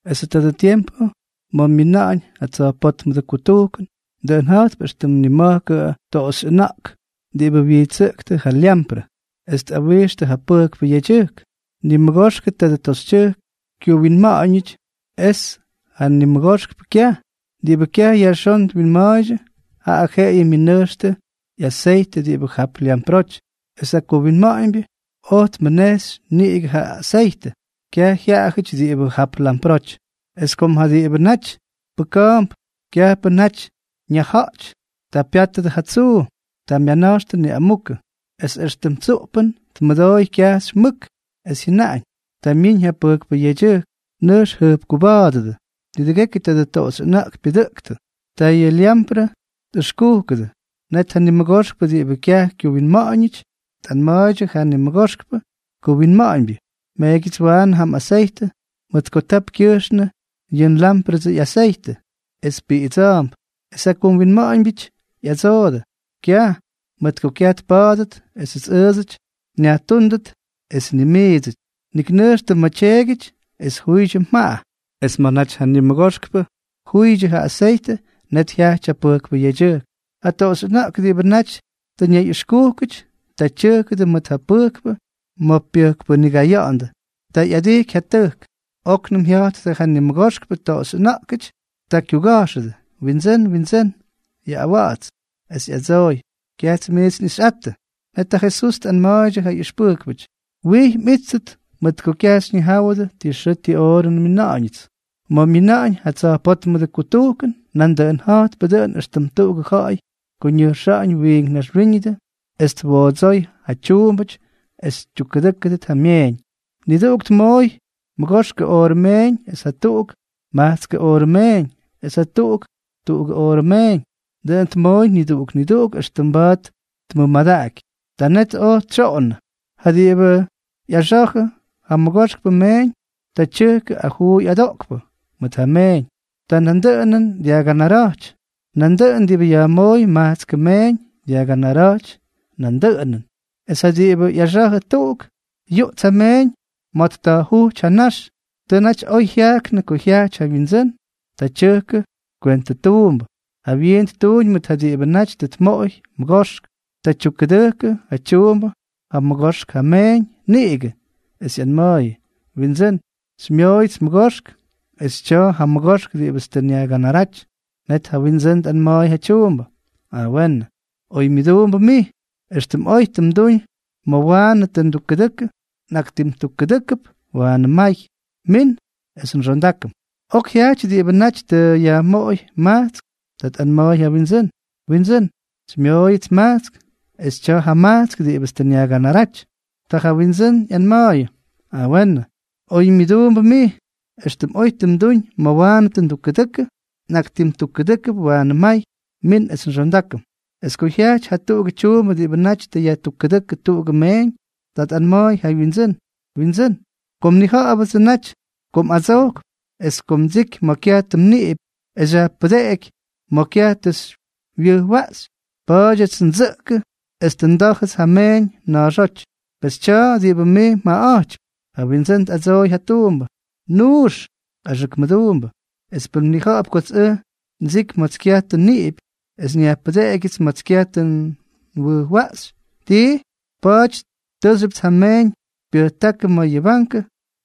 ’Esʉ tadʉ tiempʉ ma̱ myina̱ꞌa̱ñ ja tsa̱jpótmʉdʉ kutujkʉn, dʉꞌʉn ja̱jtp éxtʉm nima̱jkʉ toꞌoxyʉna̱ꞌk diꞌibʉ wyijtsʉꞌktʉ ja lyamprʉ es tꞌawixtʉ ja pʉjkpʉ yedyʉjk. Nimʉgoxkʉ tadʉ toꞌoxyʉna̱ꞌk kyuwinma̱ꞌa̱ñʉty es janimʉgoxpʉ kyaj. Diꞌibʉ kyaj yajxón twinma̱a̱ydyʉ, jaꞌa jeꞌeyʉ myʉnʉjxtʉ ꞌyaseytʉ diꞌibʉ jap lyamproty; es ja kuwinma̱ꞌa̱ñbyʉ oj tmʉnejxy niꞌigʉ ja aseytʉ, kyaj jyaꞌayʉty diꞌibʉ jap lyamproty. ’Es kom ja diꞌibʉ naty pʉka̱a̱mp kyajpʉ naty ñaja̱ꞌty, ta pyátʉdʉ ja tsuu. Ta myana̱jxtʉ niꞌamukʉ. Es éxtʉm tsuꞌpʉn tmʉdooy kyajxy mʉk, es jyʉnaꞌañ: “¡Ta myiñ ja pʉjkpʉ yedyʉjk! Nʉjx jʉjpkuba̱a̱dʉdʉ.” Nidʉgekyʉ tadʉ toꞌoxyʉna̱ꞌk pyʉdʉꞌktʉ. Ta yʉ lyamprʉ tꞌʉxkujkʉdʉ. Net ja nimʉgoxkpʉ diꞌibʉ kyaj kyuwinma̱ꞌa̱ñʉty tꞌanma̱a̱ydyʉ ja nimʉgoxkpʉ kuwinma̱ꞌa̱ñbyʉ: “Meegyʉts waanʉ ja mꞌaseytʉ, mʉt ko tap kyʉjxnʉ yʉ nlámprʉdsʉ ꞌyaseytʉ es piꞌidsa̱a̱mp.” Es ja kuwinma̱ꞌa̱ñbyʉty ꞌyadsoodʉ: “Kyaj, mʉt ko kyaj tpa̱a̱dʉt esʉts ʉʉdsʉty nyajtúndʉt es ni miidsʉty. Nik nʉjxtʉ ma̱ tyeegyʉty es juydyʉ mjaꞌa.” Es ma̱ naty ja nimʉgoxkpʉ tjuydyʉ ja aseytʉ, net jyajty ja pʉjkpʉ yedyʉjk. Ja toꞌoxyʉna̱ꞌk diꞌibʉ naty tʉ ñayꞌʉxkúkʉty, ta tyʉjkʉdʉ mʉt ja pʉjkpʉ ma̱ pyʉjkpʉnigaya̱ꞌa̱ndʉ. Ta ꞌyadijky ja tʉjk. Oknʉm jya̱jttʉ ja nimʉgoxkpʉ toꞌoxyʉna̱ꞌkʉty. Ta kyuga̱jxʉdʉ: “Windsʉ́n, windsʉ́n, yaꞌꞌawa̱ꞌa̱ts.” Es yaꞌꞌadsooy: “Kyajts miits nꞌixyꞌattʉ.” Net ja Jesús tꞌanma̱a̱ydyʉ ja ꞌyʉxpʉjkpʉty: —Wijy mꞌíttʉt, mʉt ko kyaj xyñijáwʉdʉ ti xʉʉ ti oorʉ nmina̱ꞌa̱ñʉts. ’Ma̱ myina̱ꞌa̱ñ ja tsa̱jpótmʉdʉ kutujkʉn, nandʉꞌʉn ja̱jtpʉ dʉꞌʉn éxtʉm tuꞌugʉ ja̱ꞌa̱y ko ñʉjxa̱ꞌa̱ñ wiink naxwíñʉdʉ, es twoodsooy ja tyuumbʉty es ttukkʉdʉjkʉ ja myeeñ. ’Niduꞌuk tmooy mʉgoxkʉ oorʉ meeñ es jatuꞌuk majtskʉ oorʉ meeñ es jatuꞌuk tuꞌugʉ oorʉ meeñ. Dʉꞌʉn tmooy niduꞌuk niduꞌuk éxtʉm mba̱a̱t tmʉmadaꞌaky. Ta net oj tsyoꞌonnʉ. Ja diꞌibʉ ꞌyaxa̱jʉ ja mʉgoxkpʉ meeñ, ta tyʉjkʉ ajuuy adoꞌkpʉ mʉt ja meeñ. Ta nandʉꞌʉnʉn dyajganara̱jty. Nandʉꞌʉn diꞌibʉ yajmooy majtskʉ meeñ dyajganara̱jty nandʉꞌʉnʉn. Es ja diꞌibʉ ꞌyaxa̱jʉ tuꞌuk, yuꞌts ja meeñ ma̱ tta̱jjujty ja nax. ’Tʉ naty oy jyajknʉ ko jyajty ja wyindsʉ́n. Ta tyʉjkʉ kwentʉtuumbʉ. Jawyiin ttuuñ mʉt ja diꞌibʉ naty tʉ tmoꞌoy mʉgoxk. Ta tyukkʉdʉjkʉ ja tyuumbʉ jamʉgoxk ja meeñ niꞌigʉ, es ꞌyanma̱a̱yʉ: “Windsʉ́n, xymyooyʉts mʉgoxk, es tya̱a̱ jamʉgoxk diꞌibʉts tʉ nyajganaráty.” Net ja windsʉ́n tꞌanma̱a̱y ja tyuumbʉ: “A weenʉ. Oymyʉduumbʉ mij. Extʉm oy tʉ mduñ ma̱ waanʉ tʉ ndukkʉdʉkʉ, nꞌaktimtukkʉdʉ́kʉp waanʉ may. Min es nxondákʉm.” ’Ok jyajty diꞌibʉ naty tʉ yajmoꞌoy majtsk. Ta tꞌanma̱a̱y ja wyindsʉ́n: “Windsʉ́n, xymyooyʉts majtsk, es tya̱a̱ jamajtsk diꞌibʉts tʉ nyajganaráty.” Ta ja wyindsʉ́n ꞌyanma̱a̱yʉ: “A weenʉ. Oymyʉduumbʉ mij. Extʉm oy tʉ mduñ ma̱ waanʉ tʉ ndukkʉdʉkʉ, nꞌaktimtukkʉdʉ́kʉp waanʉ may. Min es nxondákʉm.” ’Es ko jyajty jatuꞌugʉ tyuumbʉ diꞌibʉ naty tʉ yajtukkʉdʉ́kʉ tuꞌugʉ meeñ, ta tꞌanma̱a̱y ja wyindsʉ́n: “Windsʉ́n, kom nnija̱ꞌa̱bʉdsʉ naty ko mꞌadsojkp, es ko mdsiky ma̱ kyaj tʉ mniꞌipy es xyajpʉdeꞌeky ma̱ kyaj tʉ xywyʉjwaꞌxy, pa̱a̱dyʉts ndsʉꞌkʉ es tʉ ndá̱jʉts ja mmeeñ na̱a̱xóty. Pes tya̱a̱ diꞌibʉ mij mjaꞌaꞌa̱jtypy.” Ja windsʉ́n tꞌadsooy ja tyuumbʉ: “¡Nuux, axʉk mʉduumbʉ! Es pʉn mnija̱ꞌa̱p kots ʉj ndsiky ma̱ts kyaj tʉ nniꞌipy es nyajpʉdeꞌegyʉts ma̱ts kyaj tʉ nwʉjwaꞌxy tii, pa̱a̱ty tʉʉxyʉpts ja nmeeñ xypyʉjtákʉ ma̱ yʉ bankʉ,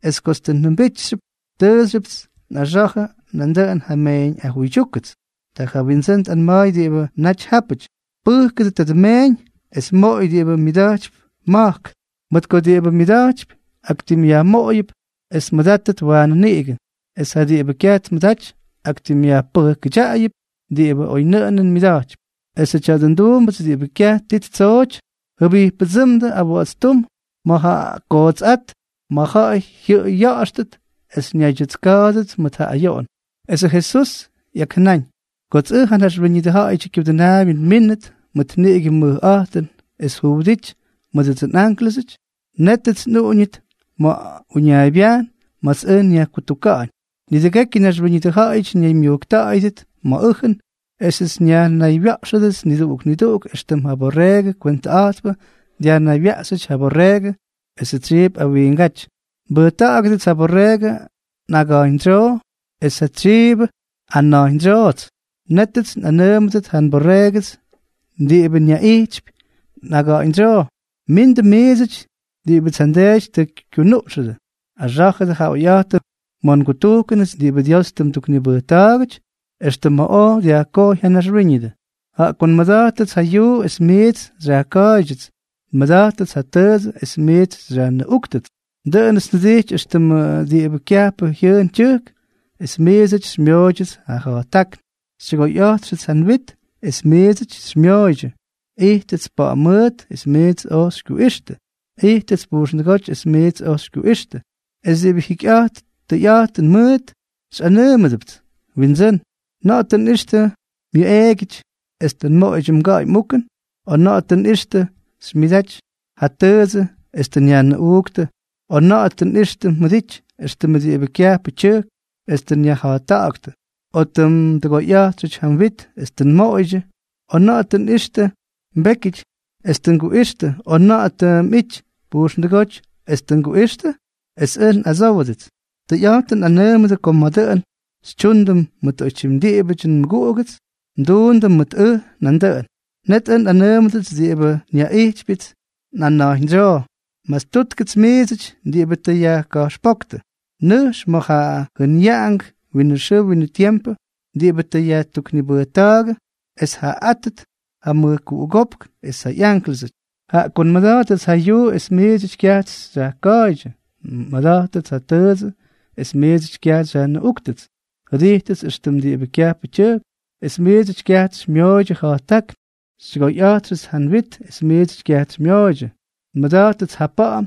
es kots tʉ njʉmbity, taaxyʉpts nꞌaxa̱jʉ nandʉꞌʉn ja nmeeñꞌajuydyúkʉts.” Ta ja windsʉ́n tꞌanma̱a̱y diꞌibʉ naty jápʉty: “Pʉjkʉdʉ tadʉ meeñ, es moꞌoy diꞌibʉ myʉda̱jtypy ma̱jk. Mʉt ko diꞌibʉ myʉda̱jtypy, aktimꞌyajmoꞌoyʉp es tmʉdátʉt waanʉ niꞌigʉ; es ja diꞌibʉ kyaj tmʉdaty, aktimꞌyajpʉjkʉdyaꞌayʉp diꞌibʉ oynʉꞌʉnʉn myʉda̱jtypy. Esʉ tya̱dʉ nduumbʉts diꞌibʉ kyaj ti ttsooty, jʉbijppʉdsʉ́mdʉ awa̱ꞌa̱tstúm ma̱ ja kootsꞌát, ma̱ ja̱ꞌa̱y jyʉꞌʉy ya̱ꞌa̱xtʉt es ñaydyʉtska̱a̱dʉdʉt mʉt ja ayoꞌon.” Esʉ Jesús ꞌyakjʉnáñ: —Kots ʉj, ja Naxwíñʉdʉ Ja̱ꞌa̱yʉdyʉ Kyudʉnaabyʉ, nmínʉt mʉt niꞌigʉ mʉjꞌa̱jtʉn es juwʉdity mʉdʉdsʉ nꞌánklʉsʉty, nétʉts nꞌuꞌuñʉt ma̱ uñaaybyajn ma̱ts ʉj nyajkutuka̱ꞌa̱ñ. Nidʉgekyʉ naxwíñʉdʉ ja̱ꞌa̱yʉty ñaymyujkta̱ꞌa̱yʉdʉt ma̱ ʉjʉn, esʉts nyajnaywya̱ꞌxʉdʉts niduꞌuk niduꞌuk éxtʉm ja borreegʉ kwentʉꞌa̱jtpʉ dyajnaywyaꞌxyʉty ja byorreegʉ esʉ tsyiip awiingáty. Nbʉjta̱ꞌa̱gʉdʉts ja borreegʉ nꞌaga̱ꞌa̱ñdsyoo es ja tsyiibʉ nꞌana̱jñdsyoots. Nétʉts nꞌanʉʉmʉdʉt ja nborreegʉts diꞌibʉts nyaꞌijtypy nꞌaga̱ꞌa̱ñdsyoo: “Mindʉ miidsʉty diꞌibʉts ja nDeety tʉ kyunuꞌxʉdʉ. Axá̱jʉdʉ ja oyꞌa̱jtʉn ma̱ ngutujkʉnʉts diꞌibʉ Dios mduknibʉjta̱a̱gʉty extʉ ma̱ oj dyajkojy ja naxwíñʉdʉ. Jaꞌa ko nmʉda̱jtʉts ja yuu es miits xyajka̱a̱ydyʉts, nmʉda̱jtʉts ja tʉʉdsʉ es miits xyajnʉꞌúktʉts, dʉꞌʉnʉts njʉdijty éxtʉm diꞌibʉ kyajpʉ jyʉʉn tyʉjk, es miidsʉts xymyooydyʉ ja̱jttákn, xytyʉgoyꞌa̱jtxʉts ja nwit es miidsʉts xymyooydyʉ, ijtʉts pa̱ꞌa̱m mʉʉt es miidsʉts oj xykyuꞌixtʉ, ijtʉts pujxndʉgóty es miidsʉts oj xykyuꞌixtʉ.” ’Es diꞌibʉ jikyꞌa̱jt tʉyꞌa̱jtʉn mʉʉt xyꞌanʉʉmʉdʉpts: “Windsʉ́n, ¿na̱ꞌa̱ tʉ nꞌixtʉ myuꞌeegyʉty es tʉ nmoꞌoydyʉ mga̱ꞌa̱y mꞌukʉn, o na̱ꞌa̱ tʉ nꞌixtʉ xymyʉdaty ja tʉʉdsʉ es tʉ nyajnʉꞌuuktʉ, o na̱ꞌa̱ tʉ nꞌixtʉ mjʉdity éxtʉm diꞌibʉ kyajpʉ tyʉjk, es tʉ nyajja̱jtta̱ꞌa̱ktʉ, o tʉ mdʉgoyꞌa̱jtxʉty ja mwit es tʉ nmoꞌoydyʉ, o na̱ꞌa̱ tʉ nꞌixtʉ mbékyʉty es tʉ nguꞌixtʉ, o na̱ꞌa̱ tʉ mꞌity pujxndʉgóty es tʉ oj nguꞌixtʉ?” Es ʉj nꞌadsówʉdʉts: “Tʉyꞌa̱jtʉn nꞌanʉʉmʉdʉ ko ma̱ dʉꞌʉn xytyuundʉ mʉt oytyim diꞌibʉty nmʉguꞌugʉts, mduundʉ mʉt ʉj nandʉꞌʉn.” ’Net ʉj nꞌanʉʉmʉdʉts diꞌibʉ nyaꞌijtypyʉts nꞌana̱jñdsyoo: “Mastúttʉgʉts miidsʉty diꞌibʉ tʉ yajka̱jxpóktʉ. Nʉjx ma̱ ja jʉnyaꞌangʉ winʉ xʉʉ winʉ tiempʉ diꞌibʉ tʉ yajtuknibʉjta̱a̱gʉ es tjaaꞌátʉt ja mʉjkuꞌugópk es ja ꞌyánklʉsʉty. Jaꞌa ko nmʉda̱jtʉts ja yuu es miidsʉty kyajts xyajka̱a̱ydyʉ, nmʉda̱jtʉts ja tʉʉdsʉ es miidsʉty kyaj xyajnʉꞌúktʉts, jʉdijtʉts éxtʉm diꞌibʉ kyajpʉ tyʉjk, es miidsʉty kyajts xymyooydyʉ ja̱jttákn, xytyʉgoyꞌa̱jtxʉts ja nwit es miidsʉty kyaj xymyooydyʉ, nmʉda̱jtʉts ja pa̱ꞌa̱m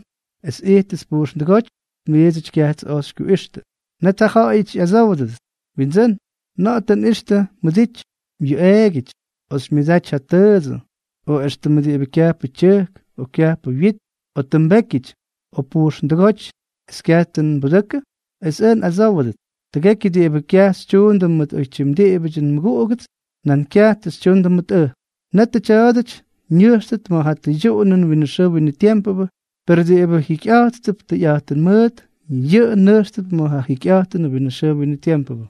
es ijtʉts pujxndʉgóty es miidsʉty kyajts oj xykyuꞌixtʉ.” ’Net jaꞌajʉty xyꞌadsówdʉdʉts: “Windsʉ́n, ¿na̱ꞌa̱ tʉ nꞌixtʉ mjʉdity myuꞌeegyʉty, o xymyʉdaty ja tʉʉdsʉ, o éxtʉmʉ diꞌibʉ kyajpʉ tyʉjk o kyajpʉ mwit, o tʉ mbékyʉty, o pujxndʉgóty es kyaj tʉ nbudʉkʉ?” Es ʉj nꞌadsówʉdʉts: “Tʉgekyʉ diꞌibʉ kyaj tʉ xytyundʉ mʉdʉ oytyim diꞌibʉty nmʉguꞌugʉts, nan kyaj tʉ xytyundʉ mʉt ʉj.” ’Netʉ tya̱a̱dʉty ñʉjxtʉt ma̱ ja tʉydyuꞌunʉnʉ winʉ xʉʉ winʉ tiempʉ, per diꞌibʉ jikyꞌa̱jttʉp tʉyꞌa̱jtʉn mʉʉt, yʉꞌʉ nʉjxtʉp ma̱ ja jikyꞌa̱jtʉnʉ winʉ xʉʉ winʉ tiempʉ.